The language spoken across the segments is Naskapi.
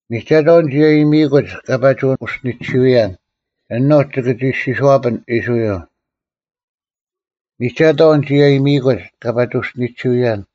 ᒥᒐᑥᐤ ᓂᒋ ᐊᔨᒥᐃᑯᒡ ᑲ ᐸᒋ ᐅᔅᒋᓂᒋᐅᔭᓐ, ᐊᓄᒡ ᒋᑭ ᒋ ᐃᔅᒋᔄᐱᓐ ᐃᔅᕋᐃᓪ; ᒥᒐᑥᐤ ᓂᒋ ᐊᔨᒥᐃᑯᒡ ᑲ ᐸᒋ ᐅᔅᒋᓂᒋᐅᔭᓐ;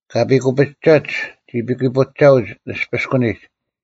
ᑲ ᐱᑯᐱᒐᒡ ᒋ ᐱᑯᐱᒐᐅᒡ ᓂᔅᐱᔅᑯᓂᒡ;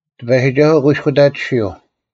ᑎᐸᔨᒋᒐᓱᐤ ᑯᐃᔅᑯᑕᑎᓯᐤ: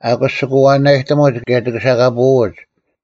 ᐊᑯᔅ ᒋᑭ ᐛᐛᓇᔨᑎᒧᒡ ᑭᔭ ᒋᑭ ᐊᓴᑲᐳᐅᒡ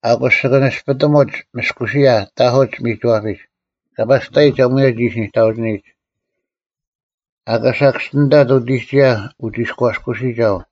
ᐊᑯᔅ ᒋᑭ ᓂᔅᐱᑎᒧᒡ ᒥᔅᑯᓯᔭ ᑕᐧᑯᒡ ᒥᒋᐛᐱᒡ, ᑲ ᐸᔅᑕᔨᒡ ᐊᒺᔭ ᒋᓯ ᓂᑕᐅᒋᓂᔨᒡ; ᐊᑲ ᓴᑭᔅᒋᓂᑕᑦ ᐅᑎᒋᔭ ᐅᒋᔅᑲᔅᑯᓯᒐᐤ,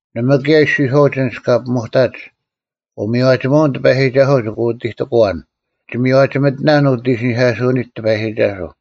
ᓇᒪ ᑭᔭ ᐃᔅᒋᔄᐅᒡ ᐊᓐᒡ ᑲ ᐱᒧᑕᒡ, “ᐅᒥᔽᒋᒧᐛᐅᓐ ᑎᐸᔨᒋᒐᓱᐤ ᒋᑭ ᐅᑎᑎᑯᐛᓐ: ᒋ ᒥᔽᒋᒥᑎᓇᓐ ᐅᑦ ᐃᓯᓂᐧᑲᓱᐅᓂᒡ ᑎᐸᔨᒋᒐᓱᐤ᙮”